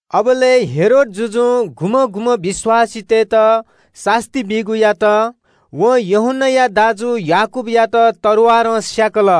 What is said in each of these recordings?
अबलय् हेरोद जुजुं गुम्‍हं गुम्‍हं विश्‍वासीतय्‌त सास्‍ती बीगु यात। वं यूहन्‍नाया दाजु याकूबयात तरवारं स्‍याकल।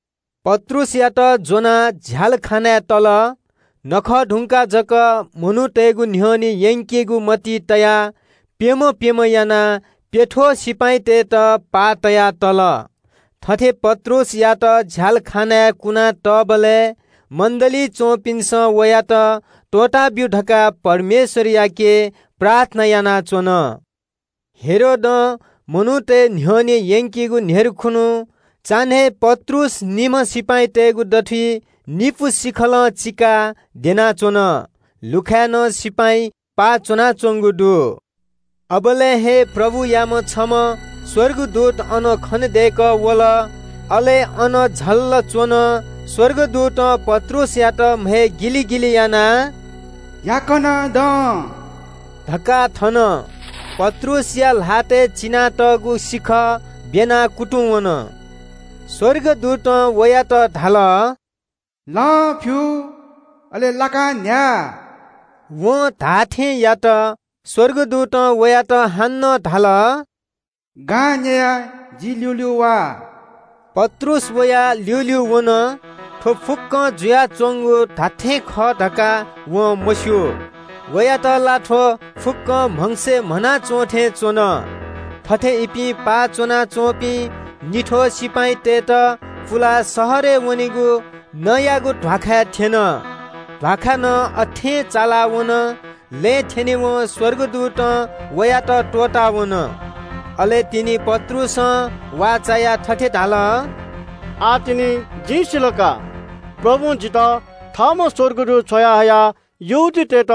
पत्रुसयात ज्‍वनाः झ्‍यालखानाय् तल। छुत्‍काराया नखः धुंकाः जक मनूतय्‌गु न्‍ह्यःने यंकेगु मतिइ तयाः प्‍यम्‍ह प्‍यम्‍ह यानाः प्‍यथ्‍वः सिपाइँतय्‌त पाः तया तल। पत्रुसयात झ्‍यालखानाय् कुनातःबलय् मण्‍डलीइ च्‍वंपिन्‍सं वयात त्‍वःताब्‍यु धकाः परमेश्‍वरयाके प्रार्थना यानाच्‍वन। हेरोदं मनूतय् न्‍ह्यःने यंकेगु न्‍ह्यर्खुन्‍हु चान्‍हय् पत्रुस निम्‍ह सिपाइँतय्‌गु दथुइ निपु सिखलं चिकाः द्यनाच्‍वन। लुखाय् नं सिपाइँ पाः च्‍वनाच्‍वंगु दु। अबलय् हे प्रभुयाम्‍ह छम्‍ह स्‍वर्गदूत अन खनेदय्‌कः वल। अले अन झल्‍ल च्‍वन। स्‍वर्गदूतं पत्रुसयात म्‍हय् गिलिगिलि यानाः “याकनं दँ” धकाः थन। पत्रुसया ल्‍हातय् चिनातःगु सिखः ब्‍यनाः कुतुंवन। स्‍वर्गदूतं वयात धाल – “लं फ्‍यु अले लाकां न्‍ह्या।” वं धाःथें यात। स्‍वर्गदूतं वयात हानं धाल – “गां न्‍ययाः जि ल्‍यूल्‍यू वा।” पत्रुस वया ल्‍यूल्‍यू वन। थ्‍व फुक्‍कं जुयाच्‍वंगु धात्‍थें खः धकाः वं मस्‍यू। वयात ला थ्‍व फुक्‍कं म्‍हगसय् म्‍हना च्‍वंथें च्‍वन। थथे इपिं पाः च्‍वनाच्‍वंपिं निथ्‍वः सिपाइँतय्‌त पुलाः शहरय् वनेगु नँयागु ध्‍वाखाय् थ्‍यन। ध्‍वाखा नं अथें चालावन, लँय् थ्‍यनेवं स्‍वर्गदूतं वयात त्‍वःतावन। अले तिनि पत्रुसं वाः चायाः थथे धाल – “आः तिनि जिं सिल का, प्रभुं जितः थःम्‍ह स्‍वर्गदूत छ्वयाहयाः यहूदीतय्‌त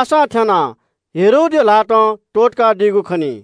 आशां थ्‍यानाः हेरोदया ल्‍हातं त्‍वःतकादीगु खनी।”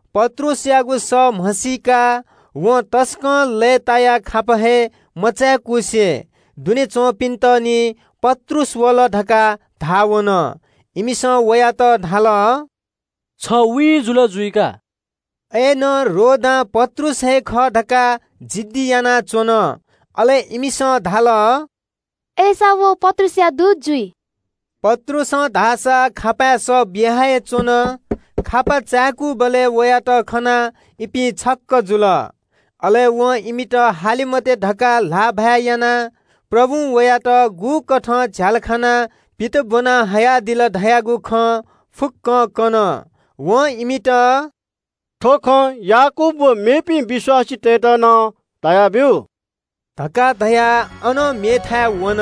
पत्रुसयागु सः म्‍हसीकाः वं तसकं लय्‌तायाः खापा हे मचाय्‌कुसे दुने च्‍वंपिन्‍त निं “पत्रुस वल” धकाः धाः वन। इमिसं वयात धाल – “छ वीँ जुल जुइ का।” अय्‌नं रोदां पत्रुस हे खः धकाः जिद्दी यानाच्‍वन। अले इमिसं धाल – “अय्‌सा व पत्रुसया स्‍वर्गदूत जुइ।” पत्रुसं धाःसा खापाय् सः बिया हे च्‍वन। खापा चाय्‌कूबलय् वयात खनाः इपिं छक्‍क जुल। अले वं इमित हाले मते धकाः ल्‍हाःभाय् यानाः प्रभुं वयात गुकथं झ्‍यालखानां पित ब्‍वना हयादिल धयागु खँ फुक्‍क कन। वं इमित – “थ्‍व खँ याकूब व मेपिं विश्‍वासीतय्‌त नं धयाब्‍यु” धकाः धयाः अनं मेथाय् वन।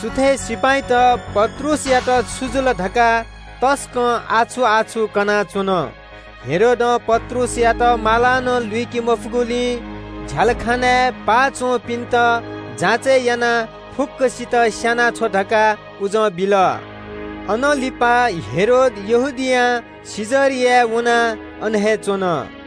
सुथय् सिपाइँत “पत्रुसयात छु जुल” धकाः तसकं आछु-आछु कनाच्‍वन। हेरोदं पत्रुसयात मालां नं लुइके मफुगुलिं झ्‍यालखानाय् पाः च्‍वंपिन्‍त जाँचय् यानाः फुक्‍कसित स्‍यानाछ्व धकाः उजं बिल। अनं लिपा हेरोद यहूदियां कैसरियाय् वनाः अन हे च्‍वन।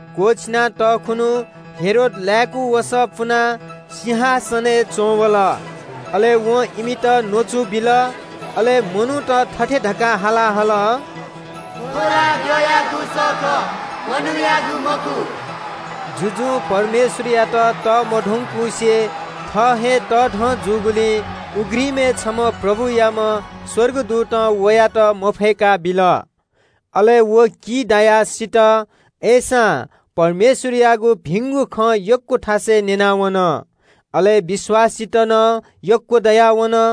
क्‍वःछिना तःखुन्‍हु हेरोद लाय्‌कू वसः पुनाः सिंहासनय् च्‍वंवल। अले वं इमित न्‍वचु बिल। अले मनूत थथे धकाः हाला हल – “थ्‍व ला द्यःयागु सः खः, मनूयागु मखु।” जुजुं परमेश्‍वरयात तःमधंकुसे थः हे तःधं जूगुलिं उघ्रिमय् छम्‍ह प्रभुयाम्‍ह स्‍वर्गदूतं वयात मफय्‌काबिल। अले व की दायाः सित। अय्‌सां परमेश्‍वरयागु भिंगु खँ यक्‍व थासय् न्‍यनावन, अले विश्‍वासीत नं यक्‍व दयावन।